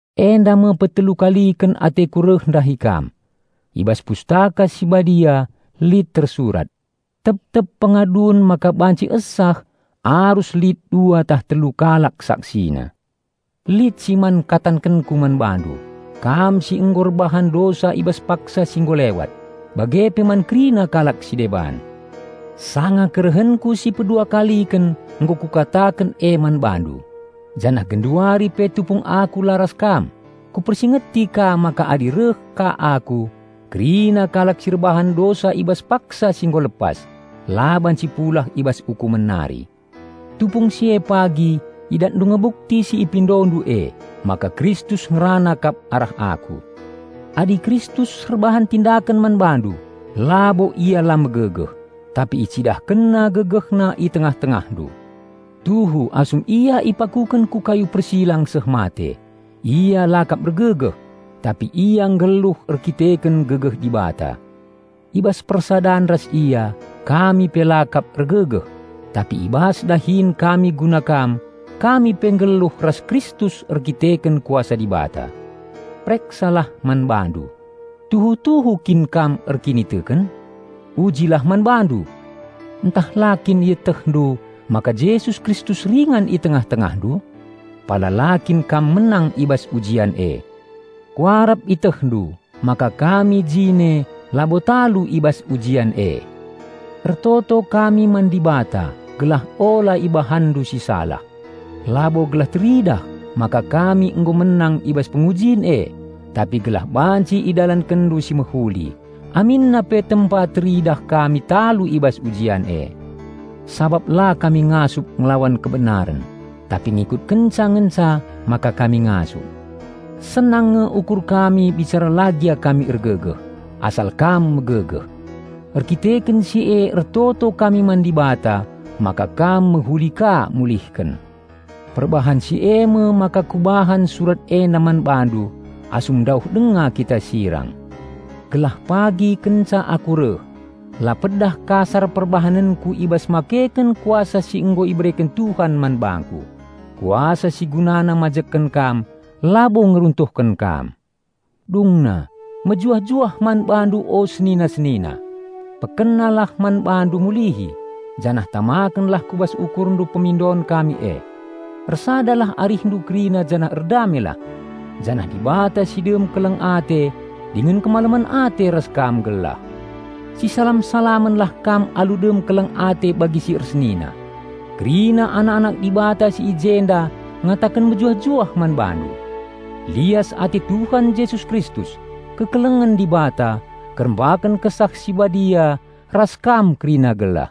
Enda me petelu kaliken ateku reh ndahi kam. I bas Pustaka Si Badia lit tersurat, "Tep-tep pengadun maka banci esah arus lit dua tah telu kalak saksina." Lit si man katankenku man bandu, kam si nggo erbahan dosa i bas paksa si nggo lewat, bage pe man kerina kalak si deban. Sanga kerehenku si pedua kaliken nggo kukataken e man bandu, janah genduari pe tupung aku la ras kam, kupersingeti ka maka adi reh ka aku, kerina kalak si erbahan dosa i bas paksa si nggo lepas la banci pulah i bas ukumen nari. Tupung si e pagi idatndu nge bukti si ipindondu e, maka Kristus ngerana kap arah aku. Adi Kristus erbahan tindaken man bandu, labo Ia la megegeh, tapi IcidahkenNa GegehNa i tengah-tengahndu. Tuhu asum Ia ipakuken ku kayu persilang seh mate, Ia la kap ergegeh, tapi Ia nggeluh erdandanken gegeh Dibata. I bas persadan ras Ia, kami pe la kap ergegeh; tapi i bas dahin kami guna kam, kami pe nggeluh ras Kristus erdandanken kuasa Dibata. Pereksalah man bandu: tuhu-tuhu kin kam erkiniteken? Ujilah man bandu! Ntah la kin ietehndu maka Jesus Kristus ringan i tengah-tengahndu? -- Pala la kin kam menang i bas ujian e. Kuarap ietehndu maka kami jine labo talu i bas ujian e. Ertoto kami man Dibata gelah ula ibahanndu si salah -- labo gelah teridah maka kami nggo menang i bas pengujin e, tapi gelah banci idalankenndu si mehuli, aminna pe tempa teridah kami talu i bas ujian e. Sabap la kami ngasup ngelawan kebenaren, tapi ngikutkenca ngenca maka kami ngasup. Senang nge ukur kami bicara la gia kami ergegeh, asal kam megegeh. Erkiteken si e ertoto kami man Dibata maka kam mehuli ka mulihken. Perbahan si eme maka kubahan surat enda man bandu asum ndauh denga kita sirang; gelah pagi kenca aku reh, la pedah kasar perbahanenku i bas makeken kuasa si nggo ibereken Tuhan man bangku, kuasa si gunana mbangun kam, labo ngeruntuhken kam. Dungna, mejuah-juah man bandu o senina-senina! Pekenalah man bandu mulihi, janah tamakenlah ku bas ukurndu pemindon kami e. Ersadalah arihndu kerina janah erdamelah. Janah Dibata si dem keleng ate dingen kemalemen ate ras kam gelah. Sisalam-salamenlah kam alu dem keleng ate bagi si ersenina. Kerina anak-anak Dibata si i jenda ngataken mejuah-juah man bandu. Lias ate Tuhan Jesus Kristus, kekelengen Dibata, kerembaken Kesah Si Badia ras kam kerina gelah.